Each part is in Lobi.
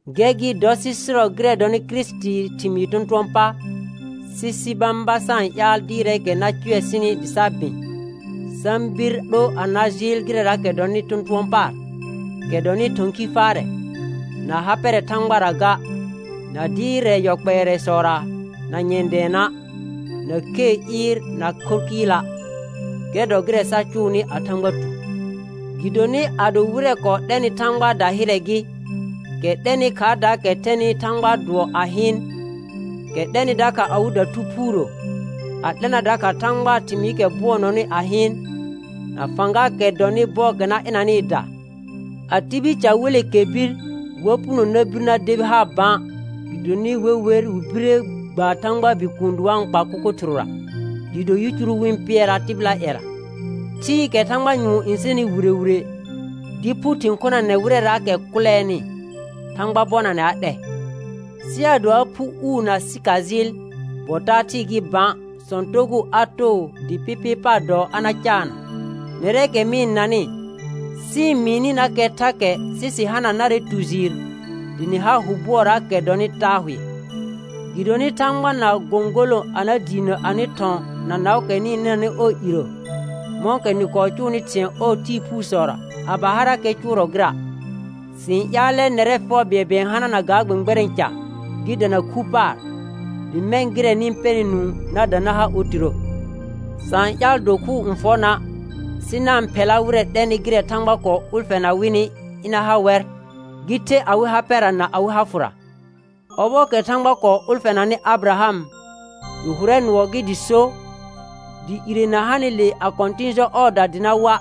Gɛr gɩ dɔ sɩ sɩrɔ gɩrɛ dɔnɩ Kirisitii thɩmɩɩ tɔ̃tʋ̃ɔ pa, sɩ sɩ bãba sa-n ƴaal dɩɩrɛɛkɛ na cʋɛ sɩnɩ dɩ sa bɩ̃; sa-n bir 'lo a na jɩɩl gɩrɛraakɛ dɔnɩ tɔ̃tʋ̃ɔ paar, kɛ dɔnɩ thɔ̃ khi faarɛ, na ha pɛrɛ Thãgbara ga, na dɩɩrɛ yɔ kpɛɛrɛsɔra na nyɛ̃ dɛɛna', na khee ɩɩr na khorr kɩɩla'. Gɛr dɔ gɩrɛ sa cʋʋnɩ a Thãgba tu. Gɩdonɩ ado wɩrɛ kɔɔ 'lɛnɩ Thãgbaa dahɩrɛ gɩ, kɛ 'lɛnɩ khaardaakɛ thɛnɩ Thãgbaa dʋɔ a hɩɩn, kɛ 'lɛnɩ dakha awɩda Thu Phuurə, a 'lɛna dakha Thãgbaa thɩmɩɩkɛ bʋɔnɔnɩ a hɩɩn, na fãgaakɛ dɔnɩ bɔɔkɛ n ɩnanɩɩda; a tibil ca wele kɛr bir, wa puno na bir na debi haar bã, gɩdonɩ we wer wɩ bire gba Thãgbaa Bikuun dɩ wa-n kpa kʋkʋ thɩrʋra, dɩɩ do yicuru wɩ-n pɩɛraa tɩbɩlaa ƴɛra. Thɩɩkɛ thãgba nyʋɔn n sɛnɩ wire wire dɩ phu thɩ̃ khonanɛ wɩrɛraakɛ kʋlɛɛnɩ, Thãgba bɔnanɛ a 'lɛ. Sɩ ado a phu uu na sɩkajɩɩl, bɔ taa thɩɩ gɩ bã, sɔ̃ togʋʋ a too dɩ pɩpɩɩ paar dɔɔ a na caanna. Nɛrɛɛkɛ mɩ-n nanɩ, sɩ-n mɩɩnɩnakɛ thakɛ sɩ sɩ hana narɛ tu jɩɩr dɩ nɩ har hʋ bʋɔraakɛ dɔnɩ taa hʋɛ. Gɩdonɩ Thãgba na gõgolõ a na diinə anɩ thɔ̃ na naʋʋkɛ nɩ-n nɩnanɩ ɔɔ irə, mɔ̃kɛ nɩ kɔɔ cʋʋnɩ thɩ̃ɛ ɔɔ tɩɩ phusɔra a ba harakɛ cʋʋrɔ gɩra'. Sɩ-n ƴaalɛ nɛrɛ fɛʋ bɩɛlbɩɛl n hanana ga gbɛ̃gbɛrɛ̃ ca gɩ dana khu paar; dɩ mɛ̃ gɩrɛ nɩ-n pɛnɩ nũu na dã na ha otirə. Sa-n ƴaal dokhʋʋr n fɔ na', sɩ na-n phɛla wɩrɛ 'lɛnɩ gɩrɛ Thãgba kɔɔ ʋlfɛna wɩnɩ ɩna ha wɛr, gɩ the awɩ ha pɛra na awɩ ha fʋra. Ɔbɔɔkɛ Thãgba kɔɔ ʋlfɛnanɩ Abɩraham, gɩ hʋrɛ nʋɔ gɩ dɩ so, dɩ ire na hanɩle a kɔ̃tɩ̃ jɔ ɔɔda dɩ na wa',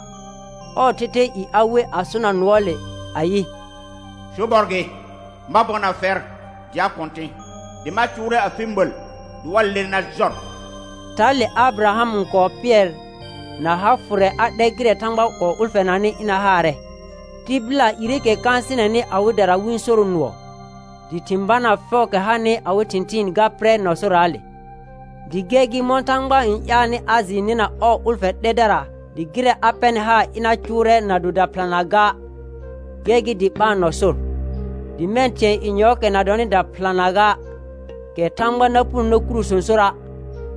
ɔɔ thɛthɛɛ i a we a sona nʋɔɔle, ayɩ: «Sobɔr gɩ, ma bɔna fɛr dɩ a kɔ̃tɩ̃, dɩ ma cʋʋrɛ afɩ məl dɩ wa ler na jɔr.» Thale Abɩraham n kɔɔ pɩɛr na ha fʋrɛ a 'lɛ gɩrɛ Thãgba kɔɔ ʋlfɛnaanɩ ɩna haarɛ. Tɩbɩla ireekɛ kãasɩnɛnɩ awɩdara wɩ-n soro nʋɔ, dɩ thɩ̃ banaa fɛʋʋkɛ hanɩ awɩ thɩ̃thɩɩn ga pɩrɛ nɔ sorraale. Dɩ gɛr gɩ mɔ̃ Thãgba n ƴaalnɩ a jɩɩ nɩna ɔɔ ʋlfɛ 'lɛdara dɩ gɩrɛ a pɛrnɩ haar ɩna cʋʋrɛ na do daphɩlanaa ga, gɛr gɩ dɩ ɓaan nɔ sor. Dɩ mɛ̃ thɩ̃ɛ yenyɔɔkɛ na dɔnɩ daphɩlanaa ga, kɛ Thãgba na punoni na kuro sõsora',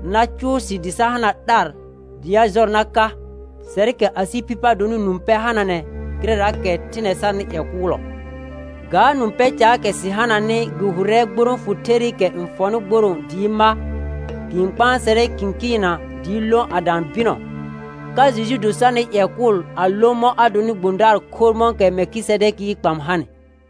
na cʋʋ sɩ dɩ sa hana 'lar dɩ a jɔr na ka, sɛrkɛ asɩ phɩ pa donɩ nũ pɛ hananɛ gɩrɛraakɛ thɩnɛ sarnɩ ƴɛ kʋʋlɔ. Ga nũ pɛ caakɛ sɩ hananɩ gɩ hʋrɛ gborõ fʋ therɩkɛ n fɔnɩ gborõo dɩɩ ma, gɩ-n kpãsɛrɛ kɩ̃kɩɩnna dɩɩ lõ a dã bɩnɔ, ka Jejn do sarnɩ ƴɛ kʋl a lõ mɔ̃ a donɩ gbõdaar khorr mɔ̃kɛ Mɛlkɩsɛdɛkɩɩ kpam hanɩ.